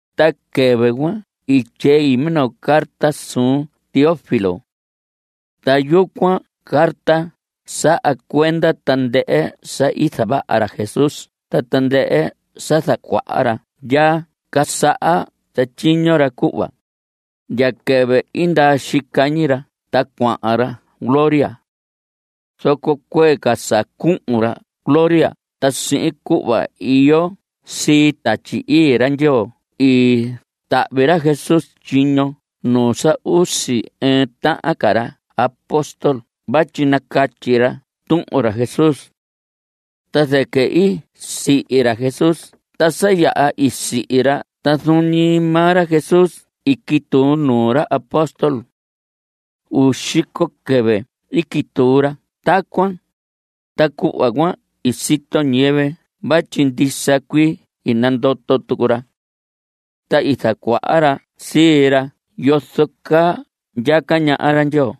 Ta quɨvɨ cuan i tyei minoo carta suun Teófilo. Ta yucuan carta saha cuenda tandɨhɨ sa i zavaha ra Jesús ta tandɨhɨ sa zacuaha ra ndya casaha zatyiño ra cuhva ndya quɨvɨ i ndaa xica ñi ra ta cuahan ra gloria. Zoco cuee ca sa cuhun ra gloria ta sihin cuhva iyo sii Tatyi Ii ra Ndyoo i tahvi ra Jesús tyiño nuu sa usi ɨɨn tahan ca ra apóstol vatyi nacatyi ra tuhun ra Jesús. Ta zɨquɨ i sihi ra Jesús ta sa yaha i sihi ra ta zuun ñi maa ra Jesús i quituu nuu ra apóstol. Uu xico quɨvɨ i quituu ra tacuan, ta cuhva cuan i sito ñiyɨvɨ vatyi ndisa cuii i nandoto tucu ra. Ta i zacuaha ra sii ra yozo caa ndyaca ñaha ra Ndyoo.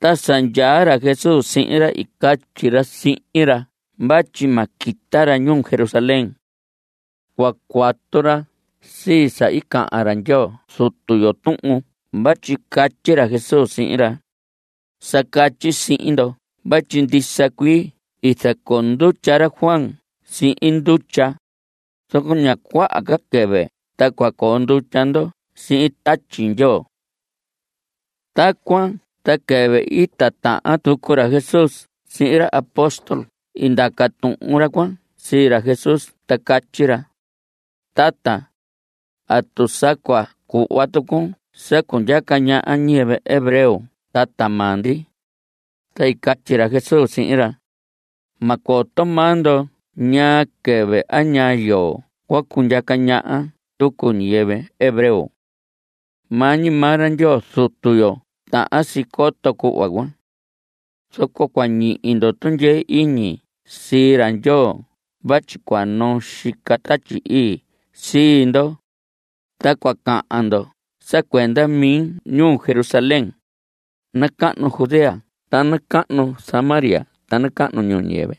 Ta sa ndyaa ra Jesús sihin ra i catyi ra sihin ra vatyi ma quita ra ñuu Jerusalén. Cua cuatu ra sii sa i cahan ra Ndyoo Zutu yo tuhun vatyi catyi ra Jesús sihin ra: Sa catyi sihin ndo vatyi ndisa cuii i zacoo ndutya ra Juan sihin ndutya, zoco ña cuaha ca quɨvɨ ta cua coo ndutya ndo sihin Tatyi Ndyoo. Tacuan ta quɨvɨ i titahan tucu ra Jesús sihin ra apóstol i ndaca tuhun ra cuan sii ra Jesús ta catyi ra: Tata, ¿atu sa cua cuhva tucun sa cundyaca ñaha ñiyɨvɨ hebreo tata maa ndi? Ta i catyi ra Jesús sihin ra: Ma coto maa ndo ñaa quɨvɨ a ñaa yoo cua cundyaca ñaha tucu ñiyɨvɨ hebreo. Maa ñi maa ra Ndyoo Zutu yo tahan si coto cuhva cuan. Zoco cua ñihi ndo tundyee iñi sii ra Ndyoo vatyi cua noo xica Tatyi Ii sii ndo, ta cua cahan ndo sa cuenda mi ñuu Jerusalén, nacahnu Judea ta nacahnu Samaria ta nacahnu ñuu ñiyɨvɨ.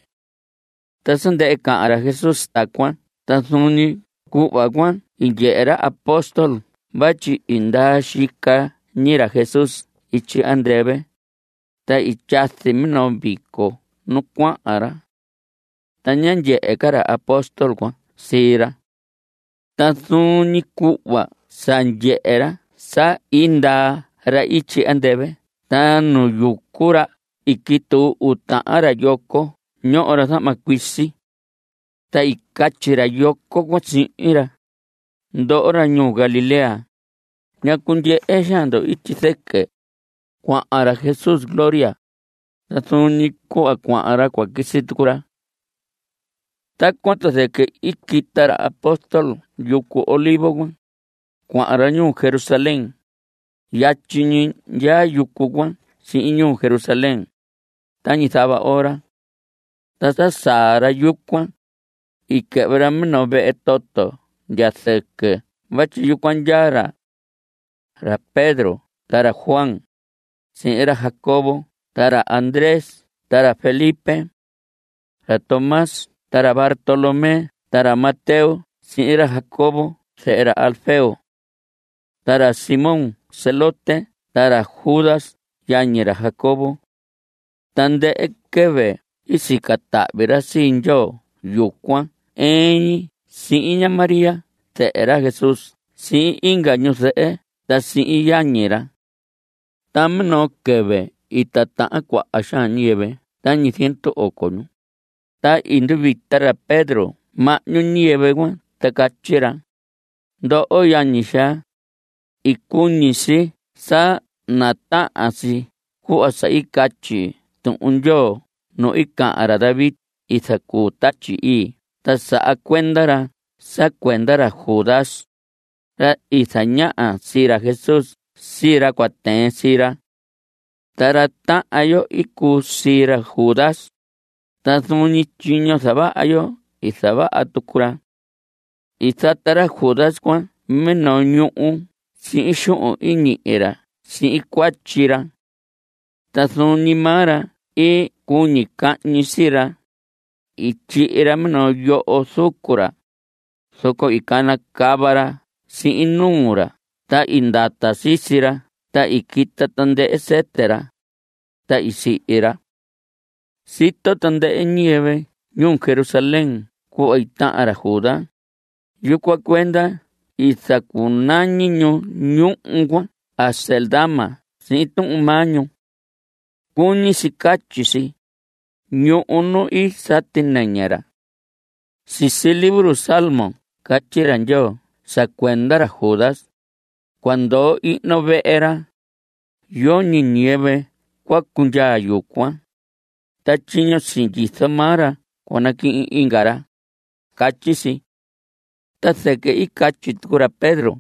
Ta sa ndɨhɨ cahan ra Jesús tacuan ta zuun ñi cuhva cuan i ndyehe ra apóstol vatyi i ndaa xica ñi ra Jesús ityi andɨvɨ, ta i tyazi minoo vico nu cuahan ra. Ta ñá ndyehe ca ra apóstol cuan sii ra. Ta zuun ñi cuhva sa ndyehe ra sa i ndaa ra ityi andɨvɨ ta nu yucu ra i quituu uu tahan ra yoco ñoho ra zahma cuisi. Ta i catyi ra yoco cuan sihin ra: Ndoho ra ñuu Galilea, ¿ñacu ndyehe xaan ndo ityi zɨquɨ? Cuahan ra Jesús gloria, ta zuun ñi cuhva cuahan ra cua quisi tucu ra. Tacuan ta zɨquɨ i quita ra apóstol yucu Olivos cuan. Cuahan ra ñuu Jerusalén. Yatyi ñi ndyaa yucu cuan sihin ñuu Jerusalén, tañi zava ora. Ta sa saa ra yucuan, i quɨhvɨ ra minoo vehe toto ndya zɨquɨ vatyi yucuan ndyaa ra. Ra Pedro ta ra Juan, sihin ra Jacobo ta ra Andrés ta ra Felipe. Ra Tomás ta ra Bartolomé ta ra Mateo sihin ra Jacobo, zehe ra Alfeo. Ta ra Simón Zelote ta ra Judas yañi ra Jacobo. Tandɨhɨ quɨvɨ i sica tahvi ra sii Ndyoo yucuan ɨɨn ñi sihin ña María zɨhɨ ra Jesús sihin inga ñu zɨhɨ ta sihin yañi ra. Ta minoo quɨvɨ i titahan cuaha xaan ñiyɨvɨ tañi ziendu oco ñu, ta i nduvita ra Pedro (mahñu ñiyɨvɨ cuan) ta i catyi ra: Ndoho yañi xaa, i cuñi si sa natahan si cuhva sa i catyi Tuhun Ndyoo nu i cahan ra David i zacuu Tatyi Ii ta saha cuenda ra sa cuenda ra Judas, ra i zañaha sii ra Jesús sii ra cua tɨɨn sii ra. Ta ra tahan yo i cuu sii ra Judas, ta zuun ñi tyiño zavaha yo i zavaha tucu ra. I zata ra Judas cuan minoo ñuhu sihin xuhun i ñihi ra sihin cuatyi ra. Ta zuun ñi maa ra i cuñi cahñi sii ra. I tyihi ra minoo yoho zucu ra, zoco i canacava ra sihin nuu ra ta i ndata sisi ra ta i quita tandɨhɨ sɨtɨ ra. Ta i sihi ra. Sito tandɨhɨ ñiyɨvɨ ñuu Jerusalén cuhva i tahan ra Judas. Yucuan cuenda i zacunañi ñu ñuhu cuan Acéldama sihin tuhun maa ñu. Cuñi si catyi si: Ñuhu nu i sati nɨñɨ ra. Sisi libro Salmos catyi ra Ndyoo sa cuenda ra Judas: Cua ndoo ihno vehe ra. Yoñi ñiyɨvɨ cua cundyaa yucuan. Ta tyiño i sindyizo maa ra cua naquihin inga ra. Catyi si. Ta zɨquɨ i catyi tucu ra Pedro: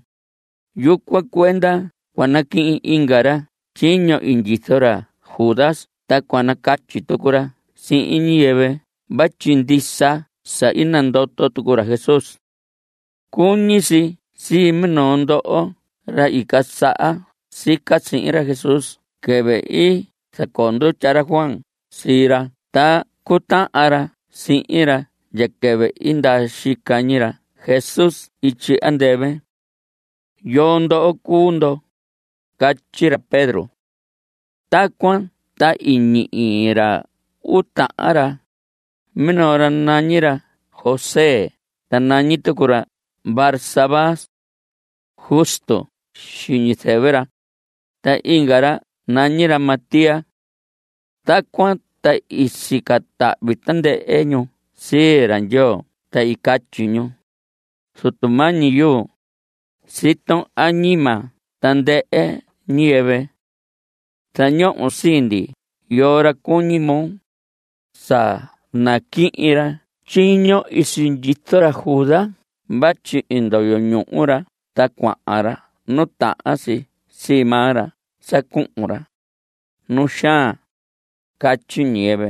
Yucuan cuenda cua naquihin inga ra tyiño i sindyizo ra Judas ta cua nacatyi tucu ra sihin ñiyɨvɨ vatyi ndisa sa i nandoto tucu ra Jesús. Cuñi si sii minoo ndoho ra i casaha sica sihin ra Jesús quɨvɨ i zacoo ndutya ra Juan sii ra ta cutahan ra sihin ra ndya quɨvɨ i ndaa xica ñi ra Jesús ityi andɨvɨ. ¿Yoo ndoho cuu ndo? Catyi ra Pedro. Tacuan ta i ñihi ra uu tahan ra. Minoo ra nañi ra José ta nañi tucu ra Barsabás. Justo xiñi zɨvɨ ra. Ta inga ra nañi ra Matías. Tacuan ta i sica tahvi tandɨhɨ ñu sii ra Ndyoo ta i catyi ñu: Zutu mañi yuu, siton añima tandɨhɨ ñiyɨvɨ. Zañohon sii ndi yoo ra cuñi moo sa naquihin ra tyiño i sindyizo ra Judas vatyi i ndoyo ñuhu ra ta cuahan ra nu tahan si sii maa ra sa cuhun ra, nu xaan. Catyi ñiyɨvɨ.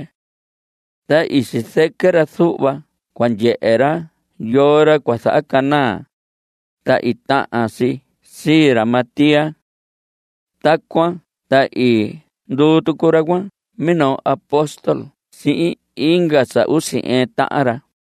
Ta i sizɨquɨ ra zuhva cua ndyehe ra yoo ra cua zahacanaa, ta i tahan si sii ra Matías. Tacuan ta i nduu tucu ra cuan minoo apostól sihin inga sa usi ɨɨn tahan ra.